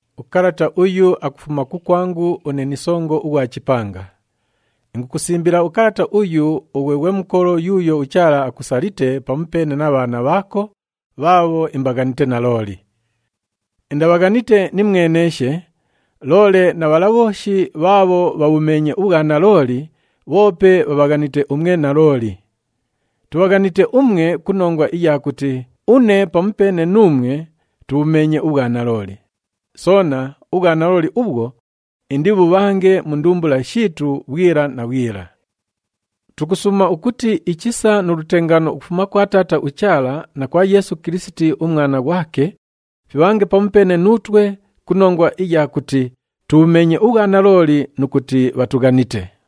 Ukalata uyu akufuma kukwangu une ni songo ughwa chipanga. Ingukusimbila ukalata uyu ughwe ghwe mukolo yuuyo uChaala akusalite pamupeene na bhaana bhaako bhaabho imbaghanite nalooli. Indabhaghanite nimweneeshe, loole na bhala bhooshi bhaabho bhabhumeenye ubhwanalooli bhoope bhabhaghanite umwe nalooli. Tubhaghanite umwe ku nongwa iya kuti une pamupeene nuumwe tubhumeenye ubhwanalooli, soona ubhwanalooli ubhwo indibhubhange mu ndumbula shiitu bhwila na bhwila. Tukusuuma ukuti ichisa nu lutengaano ukufuma kwa Taata uChaala na kwa Yeesu Kilisiti uMwana ghwake fibhange pamupeene nuutwe ku nongwa iya kuti tubhumeenye ubhwanalooli nu kuti bhatughanite.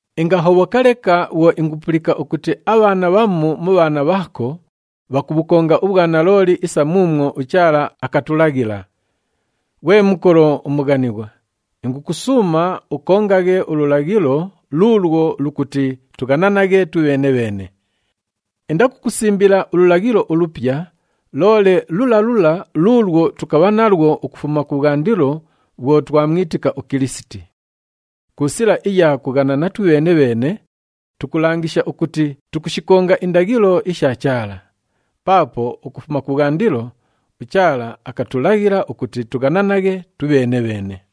Ingahobhoka leka bhwo ingupulika ukuti abhaana bhamu mu bhaana bhaako bhakubhukonga ubhwanalooli isa muumwo uChaala akatulaghila. Ghwe mukolo umughanighwa, ingukusuuma ukongaghe ululaghilo luulwo lukuti tughananaghe twibheene-bheene. Indakukusimbila ululaghilo ulupya, loole lula lula luulwo tukabha nalwo ukufuma kubhwandilo bhwo twamwitika uKilisiti. Ku sila iya kughanana twibheene-bheene, tukulangisha ukuti tukushikonga indaghilo isha Chaala. Paapo ukufuma kubhwandilo uChaala akatulaghila ukuti tughananaghe twibheene-bheene.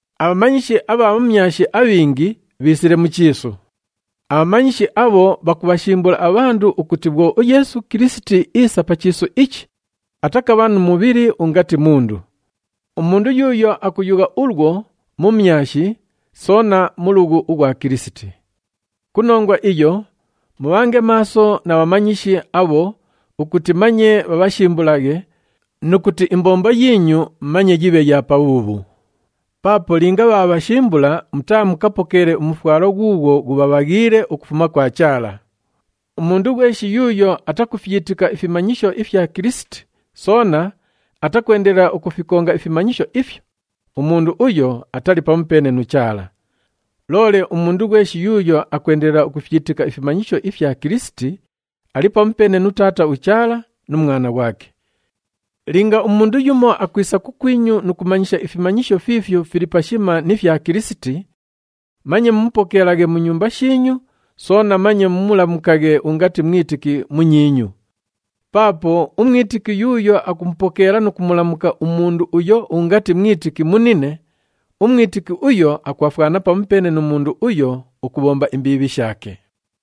Abhamanyishi abha bhumyashi abhingi bhiisile mu chiisu. Abhamanyishi abho bhakubhashimbula abhandu ukuti bhwo uYeesu Kilisiti iisa pa chiisu ichi, atakabha nu mubhili ungati mundu. Umundu yuuyo akuyugha ulwo, mumyashi soona mulughu ughwa Kilisiti. Ku nongwa iyo, mubhange maaso na bhamanyishi abho ukuti manye bhabhashimbulaghe nu kuti imbombo yiinyu manye yibhe ya pabhuubhu. Paapo linga bhaabhashimbula, mutaamukapokeele umufwalo ghuughwo ghubhabhaghiile ukufuma kwa Chaala. Umundu ghweshi yuuyo atakufyitika ifimanyisho ifya Kilisiti soona atakwendelela ukufikonga ifimanyisho ifyo, umundu uyo atali pamupeene nu Chaala. Loole umundu ghweshi yuuyo akwendelela ukufyitika ifimanyisho ifya Kilisiti, ali pamupeene nu Taata uChaala nu Mwana ghwake. Linga umundu yumo akwisa kukwinyu nu kumanyisha ifimanyisho fiifyo fili pashima ni fya Kilisiti, manye mumupokeelaghe mu nyumba shiinyu, soona manye mumulamukaghe ungati mwitiki munyiinyu. Paapo umwitiki yuuyo akumupokeela nu kumulamuka umundu uyo ungati mwitiki munine, umwitiki uyo akwafwana pamupeene nu mundu uyo ukubhomba imbiibhi shaake.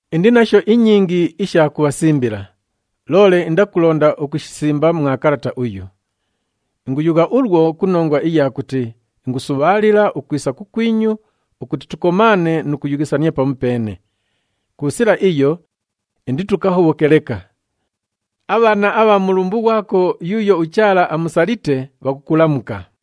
Indi nasho inyingi isha kubhasimbila, loole indakulonda ukushisimba mwa kalata uyu. Inguyugha ulwo ku nongwa iya kuti ingusubhaalila ukwisa kukwinyu ukuti tukomaane nu kuyughisania pamupeene. Ku sila iyo inditukahobhoke leka. Abhaana abha mulumbu ghwako yuuyo uChaala amusalite bhakukulamuka.